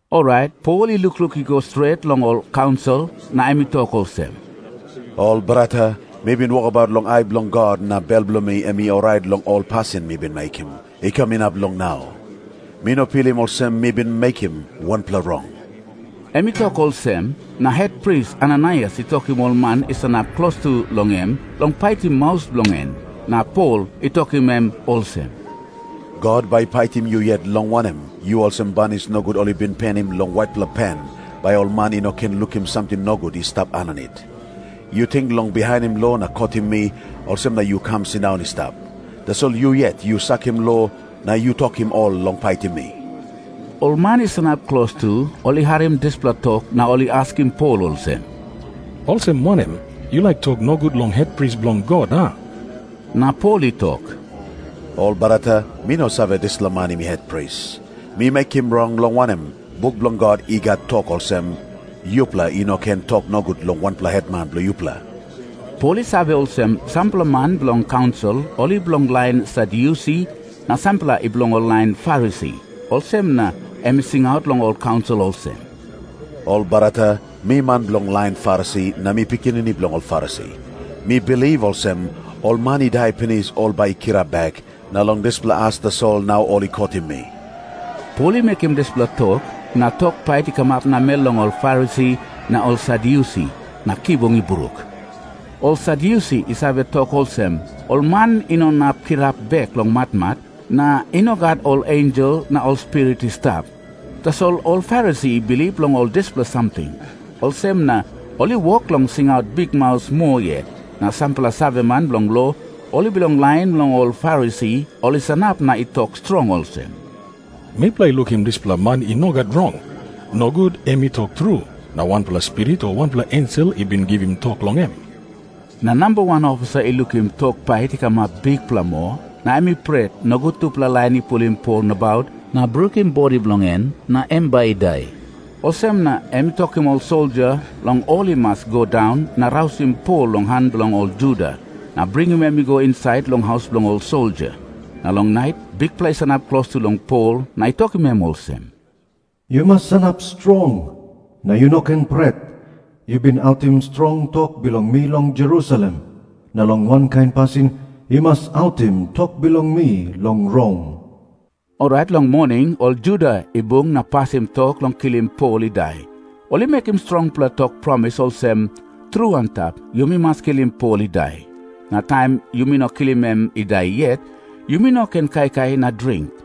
Orait Pol i lukluk i go stret long ol kaunsil, na em i tok olsem, “Ol brata, mi bin wokabaut long ai bilong God, na bel bilong mi em i orait long ol pasin mi bin mekim, i kam inap long nau. Mi no pilim olsem mi bin mekim wanpela rong.” Em i tok olsem, na hetpris Ananaias i tokim ol man i sanap klostu long em long paitim maus bilong en. Na Pol i tokim em olsem, “God bai i paitim yu yet, long wanem, yu olsem banis nogut ol i bin penim long waitpela pen, bai ol man i no ken lukim samting nogut i stap aninit. Yu ting long bihainim lo na kotim mi, olsem na yu kam sindaun i stap. Tasol yu yet yu sakim lo, na yu tokim ol long paitim mi.” Ol man i sanap klostu, ol i harim dispela tok na ol i askim Pol olsem, “Olsem wanem? Yu laik tok nogut long hetpris bilong God, a?” Na Pol i tok, “Ol brata, mi no save dispela man em i hetpris. Mi mekim rong, long wanem, buk bilong God i gat tok olsem, ‘Yupela i no ken tok nogut long wanpela hetman bilong yupela.’” Pol i save olsem, sampela man bilong kaunsil ol i bilong lain Sadyusi na sampela i bilong lain Farisi. Olsem na em i singaut long ol kaunsil olsem, “Ol brata, mi man bilong lain Farisi, na mi pikinini bilong ol Farisi. Mi bilip olsem, ol man i dai pinis ol bai i kirap bek, na long dispela as tasol nau ol i kotim mi.” Pol i mekim dispela tok, na tok pait i kamap namel long ol Farisi na ol Sadyusi, na kibung i bruk. Ol Sadyusi i save tok olsem, ol man i no inap kirap bek long matmat, na i no gat ol ensel na ol spirit i stap. Tasol ol Farisi i bilip long ol dispela samting. Olsem na ol i wok long singaut bikmaus moa yet. Na sampela saveman bilong lo, ol i bilong lain bilong ol Farisi, ol i sanap na i tok strong olsem, “Mipela i lukim dispela man i no gat rong. Nogut em i tok tru, na wanpela spirit o wanpela ensel i bin givim tok long em.” Na namba wan ofisa i lukim tok pait i kamap bikpela moa, na em i pret, nogut tupela lain i pulim Pol nabaut na brukim bodi bilong en na em bai i dai. Olsem na em i tokim ol soldia long ol i mas i go daun na rausim Pol long han bilong ol Juda, na bringim em i go insait long haus bilong ol soldia. Na long nait Bikpela i sanap klostu long Pol na i tokim em olsem, “Yu mas sanap strong, na yu no ken pret. Yu bin autim strong tok bilong mi long Jerusalem, na long wankain pasin yu mas autim tok bilong mi long Rom.” Orait long moning ol Juda i bung na pasim tok long kilim Pol i dai. Ol i mekim strongpela tok promis olsem, “Tru antap, yumi mas kilim Pol i dai. Na taim yumi no kilim em i dai yet, yumi no ken kaikai na dring.”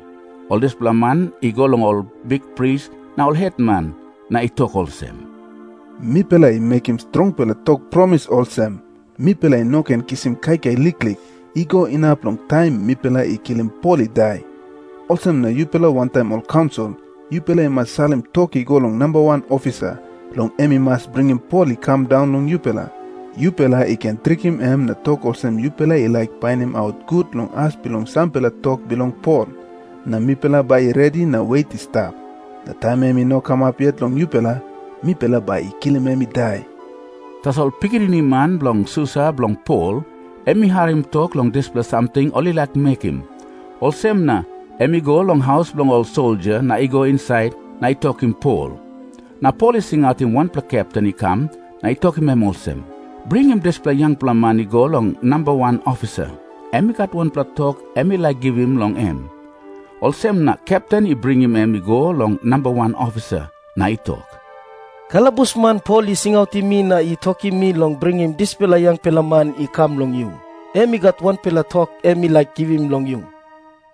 Ol dispela man i go long ol bikpris na ol hetman na i tok olsem, “Mipela i mekim strongpela tok promis olsem, mipela i no ken kisim kaikai liklik, i go inap long taim mipela i kilim Pol i dai. Olsem na yupela wantaim ol kaunsil, yupela i mas salim tok i go long namba wan ofisa, long em i mas bringim Pol i kam daun long yupela. Yupela i ken trikim em na tok olsem yupela i laik painimaut gut long as bilong sampela tok bilong Pol. Na mipela bai i redi na wet i stap. Na taim em i no kamap yet long yupela, mipela bai i kilim em i dai.” Tasol pikinini man bilong susa bilong Pol em i harim tok long dispela samting ol i laik mekim. Olsem na em i go long haus bilong ol soldia na i go insait na i tokim Pol. Na Pol i singautim wanpela kepten i kam na i tokim em olsem, “Bringim dispela yangpela man i go long namba wan ofisa. Em i gat wanpela tok em i laik givim long em.” Olsem na kepten i bringim em i go long namba wan ofisa, na i tok, “Kalabusman Pol i singautim mi na i tokim mi long bringim dispela yangpela man i kam long yu. Em i gat wanpela tok em i laik givim long yu.”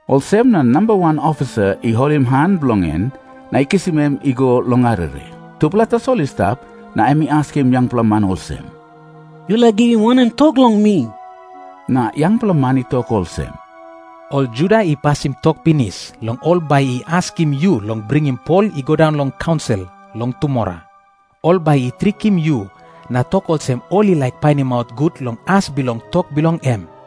Olsem na namba wan ofisa i holim han bilong en, na i kisim em i go long arere. Tupela tasol i stap, na em i askim yangpela man olsem, “Yu laik givim wanem tok long mi?” Na yangpela man i tok olsem, “Ol Juda i pasim tok pinis long ol bai i askim yu long bringim Pol i go daun long kaunsil long tumora. Ol bai i trikim yu na tok olsem ol i laik painimaut gut long as bilong tok bilong em.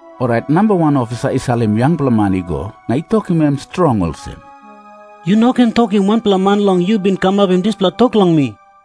Orait namba wan ofisa i salim yangpela man i go, na i tokim em strong olsem, “Yu no ken tokim wanpela man long yu bin kamapim dispela tok long mi.”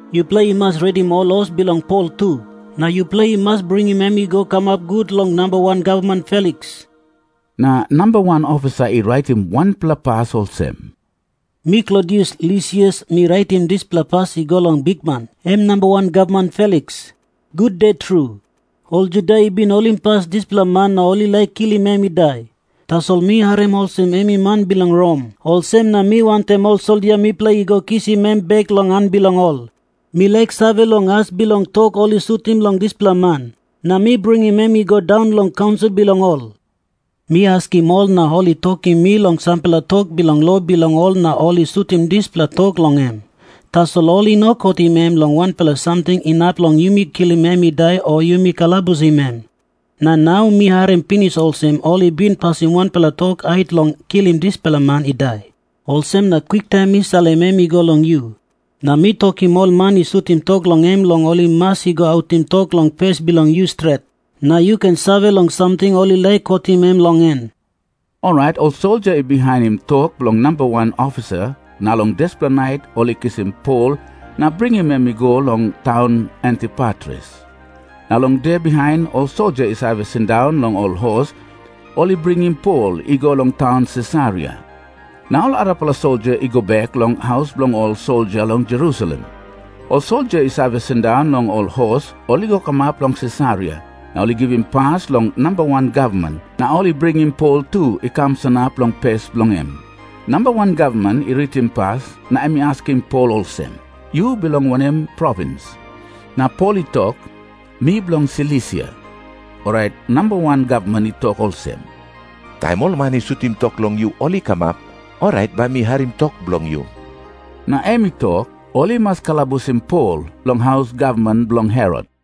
Yupela i mas redim ol hos bilong Pol tu, na yupela i mas bringim em i go kamap gut long namba wan gavman Feliks.” Na namba wan ofisa i raitim wanpela pas olsem, “Mi Klodius Lisias mi raitim dispela pas i go long bikman, em namba wan gavman Feliks. Gude tru. Ol Juda i bin holimpas dispela man na ol i laik kilim em i dai. Tasol mi harim olsem em i man bilong Rom, olsem na mi wantaim ol soldia mipela i go kisim em bek long han bilong ol. Mi laik save long as bilong tok ol i sutim long dispela man, na mi bringim em i go daun long ol kaunsil bilong ol. Mi askim ol na ol i tokim mi long sampela tok bilong lo bilong ol na ol i sutim dispela tok long em. Tasol ol i no kotim em long wanpela samting inap long yumi kilim em i dai o yumi kalabusim em. Na nau mi harim pinis olsem ol i bin pasim wanpela tok hait long kilim dispela man i dai. Olsem na kwiktaim mi salim em i go long yu. Na mi tokim ol man i sutim tok long em long ol i mas i go autim tok long pes bilong yu stret, na yu ken save long samting ol i laik kotim em long en.” Orait ol soldia i bihainim tok bilong namba wan ofisa na long dispela nait ol i kisim Pol na bringim em i go long taun Antipatris. Na long de bihain ol soldia i save sindaun long ol hos, ol i bringim Pol i go long taun Sisaria. Na ol arapela soldia i go bek long haus bilong ol soldia long Jerusalem. Ol soldia i save sindaun long ol hos ol i go kamap long Sisaria, na ol i givim pas long namba wan gavman, na ol i bringim Pol tu i kam sanap long pes bilong em. Namba wan gavman i ritim pas, na em i askim Pol olsem, “Yu bilong wanem provins?” Na Pol i tok, “Mi bilong Silisia.” Orait namba wan gavman i tok olsem, “Taim ol man i sutim tok long yu, ol i kamap, orait mi bai harim tok bilong yu.” Na em i tok, ol i mas kalabusim Pol long haus gavman bilong Herot.